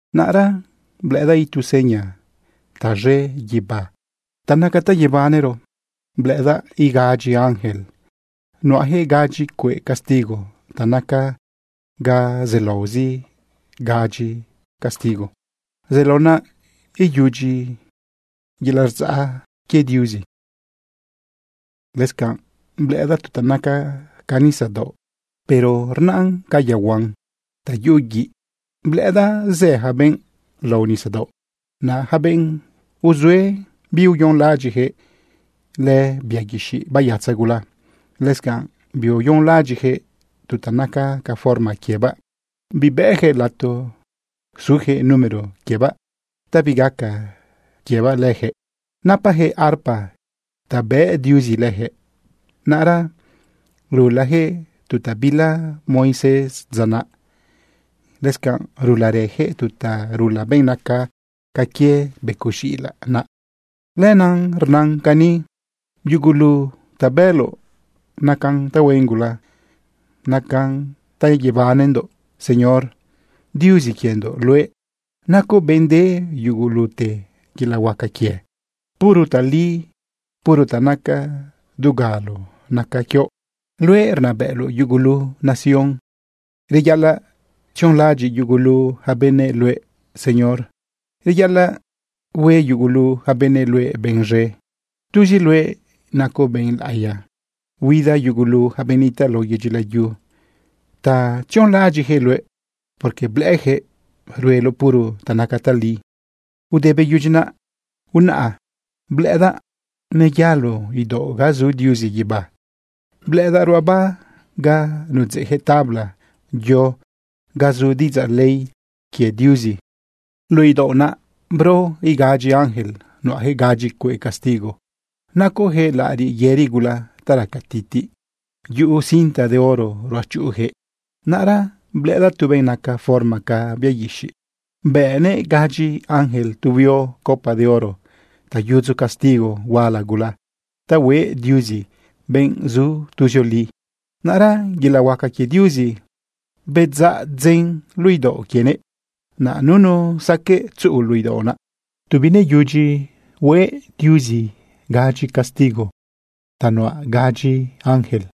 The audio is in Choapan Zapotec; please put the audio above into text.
Naꞌra blëꞌëdaꞌ itu seña taz̃e guibá ta naca ta yebanero: Blëꞌëdaꞌ igadyi ángel nuꞌajëꞌ gadyi cueꞌ castigo ta naca ga zelaozi gadyi castigo. Zelao naꞌ iyudyi yelaꞌ rdzaꞌ quie Diuzi. Lëscanꞌ blëꞌëdaꞌ tu ta naca ca nisadaoꞌ, pero rnaꞌn ca yaohuan ta yuꞌu guiꞌ. Blëꞌëdaꞌ zë ja benꞌ lao nisadaoꞌ naꞌ, ja benꞌ uzue biuyonlaꞌadyiꞌjëꞌ lëbia guixiꞌ bayatza gula. Lëscanꞌ biuyonlaꞌadyiꞌjëꞌ tu ta naca ca forma quiebaꞌ, bibëjëꞌ lato sujëꞌ número quiebaꞌ ta bigaca quiebaꞌ lëjëꞌ. Napajëꞌ arpa ta bëꞌ Diuzi lëjëꞌ. Naꞌra rulajëꞌ tu ta bila Moisés dza naꞌ. Lëscanꞌ rularëjëꞌ tu ta rula benꞌ naca ca quie becoꞌ z̃iꞌilaꞌ naꞌ. Lenaꞌ rnan cani: Yugulu ta bëloꞌ nacan tahuen gula, nacan ta yebanendoꞌ, Señor. Diuzi quiendoꞌ luëꞌ, nacoꞌ benꞌ de yugulute yelaꞌ huaca quie. Puro tali, puro ta naca dugalo naca quioꞌ. Luëꞌ rnabëꞌloꞌ yugulu nación. Reyaꞌalaꞌ tzionlaꞌadyiꞌ yugulu ja benëꞌ luëꞌ, Señor. Reyaꞌalaꞌ hue yugulu ja benëꞌ luëꞌ benꞌ z̃e. Tuzi luëꞌ nacoꞌ benꞌ laꞌiya. Huida yugulu ja benꞌ nitaꞌ lao yedyi layu ta tzionlaꞌadyiꞌjëꞌ luëꞌ, porque blëꞌëjëꞌ rueloꞌ puro ta naca tali. Ude beyudyi naꞌ, unaꞌa blëꞌëdaꞌ neyalo idaoꞌ ga zu Diuzi guibá. Blëꞌëdaꞌ ruꞌaba ga nudzeꞌjëꞌ tabla yo ga zu diꞌidzaꞌ ley quie Diuzi. Luꞌu idaoꞌ naꞌ bro igadyi ángel. Nuꞌajëꞌ gadyi cueꞌ castigo. Nacojëꞌ laꞌariꞌ yëri gula ta raca titiꞌ. Yuꞌu cinta de oro ruꞌachuꞌujëꞌ. Naꞌra blëꞌëdaꞌ tu benꞌ naca forma ca bia guixiꞌ bëꞌnëꞌ gadyi ángel tu huio copa de oro ta yudzu castigo huala gula ta hue Diuzi, benꞌ zu tuzioli. Naꞌra yelaꞌ huaca quie Diuzi bedzaꞌ dzen luꞌu idaoꞌ quienëꞌ. Naꞌ nunu saqueꞌ tzuꞌu luꞌu idaoꞌ naꞌ tu bineyudyi hue Diuzi gadyi castigo ta nuꞌa gadyi ángel.